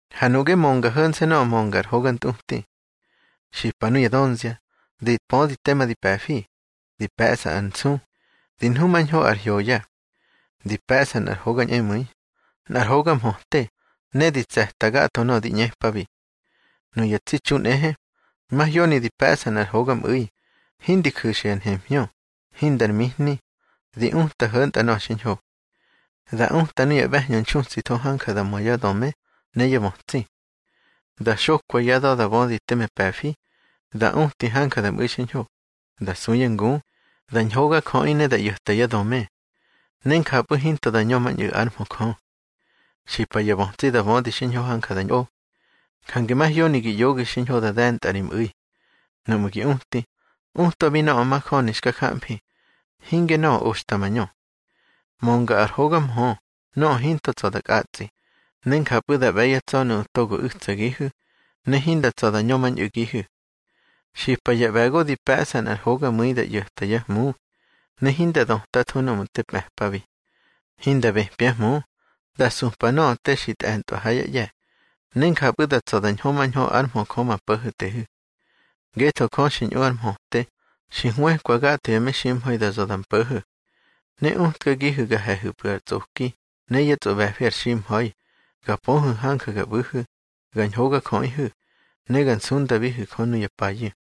Ha nuꞌge mönga ho̱nse̱ ngu mönga ar hoga ntꞌuti. Xipa nuya dönzia, di pödi tema di pe̱fi, di pe̱ꞌsa ar nsu, di nhumañho ár hyoya. Di pe̱ꞌsa nꞌar hoga ñꞌemu̱i, nꞌar hoga mhöte, ne di tse̱ta gatho nöꞌö di ꞌñepabi. Nuya tsi txu nꞌehe, mahyoni di pe̱ꞌsa nꞌar hogamꞌu̱i, hindi ju̱xa ya nhemhñö, hindar mihni, di uta ho̱ntꞌa nöꞌö xiñho. Da uta nuya ꞌbe̱hñö nxutsitho hanja da mö yá döme ne yá bötsi. Da xokwa yá da̱ da bödi teme pe̱fi, da uti hanja da mꞌu̱i xiñho, da su yá ngu, da ñhogajöꞌi ne da ꞌyo̱ta yá döme. Ne njapꞌu̱ hinto da ñömañꞌu̱ ár mhö Jö. Xipa ya bötsi da bödi xiñho hanja da ñꞌo. Jange mahyoni gi ꞌyoge xiñho da de̱ntꞌa ri mꞌu̱i. Núꞌmu̱ gi uti, utwabi nöꞌö majöni xka jamfi, hinge nöꞌö oxta mañö. Mönga ar hoga mhö nöꞌö hinto tsa̱ da kꞌatsꞌi, ne njapꞌu̱ da ꞌbe̱ yá tsa̱ nuꞌu̱ to u̱tsagihu̱, ne hinda tsa̱ da ñömañꞌu̱gihu̱. Xipa ya ꞌbe̱go di pe̱ꞌsa nꞌar hogamu̱i da ꞌyo̱ta yá hmu, ne hinda dötatho nuꞌu̱ te mꞌe̱pabi. Hinda bëpyá hmu, da supa nöꞌö te xi tꞌe̱ntꞌwa ha yá ꞌye̱, ne njapꞌu̱ da tsa̱ da ñhömañho ár mhö Jö ma Po̱ho̱tehu̱. Ngetho Jö xi ñꞌu ár mhöte xi hwëkwa gatho ya meximha̱i da za̱ da mpo̱ho̱. Ne utkagihu̱ ga he̱hu̱pꞌu̱ ar tsꞌoki ne yá tsꞌoꞌbe̱fi ar ximha̱i, ga pöhu̱ hanja ga ꞌbu̱hu̱, ga ñhogajöꞌihu̱, ne ga nsundabihu̱ Jö nuya payu̱.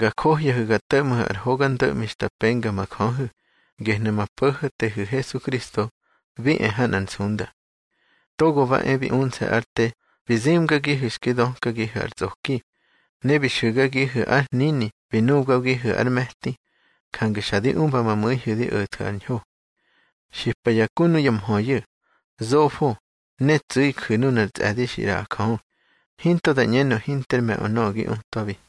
Ga johyahu̱ ga to̱ꞌmhu̱ ar hoga ndo̱ꞌmi xta penga ma Jöhu̱, gehnu̱ ma Po̱ho̱tehu̱ Hesukristo bi e ha nꞌar nsunda. Togo ba e bi unse̱ ár te bi zimgagihu̱ xki dökagihu̱ ar tsꞌoki, ne bi xu̱gagihu̱ ár hnini bi nubgagihu̱ ár me̱ti, jange xa di umba ma mu̱ihu̱ di o̱thu̱ ar ñho. Xipa ya ku nuya mhöyu̱, zofo, ne tsu̱i ju̱ nunar tsꞌe̱di xi ꞌraꞌa Jö, hinto da ꞌñenö hinter me̱ꞌö nöꞌö gi utwabi.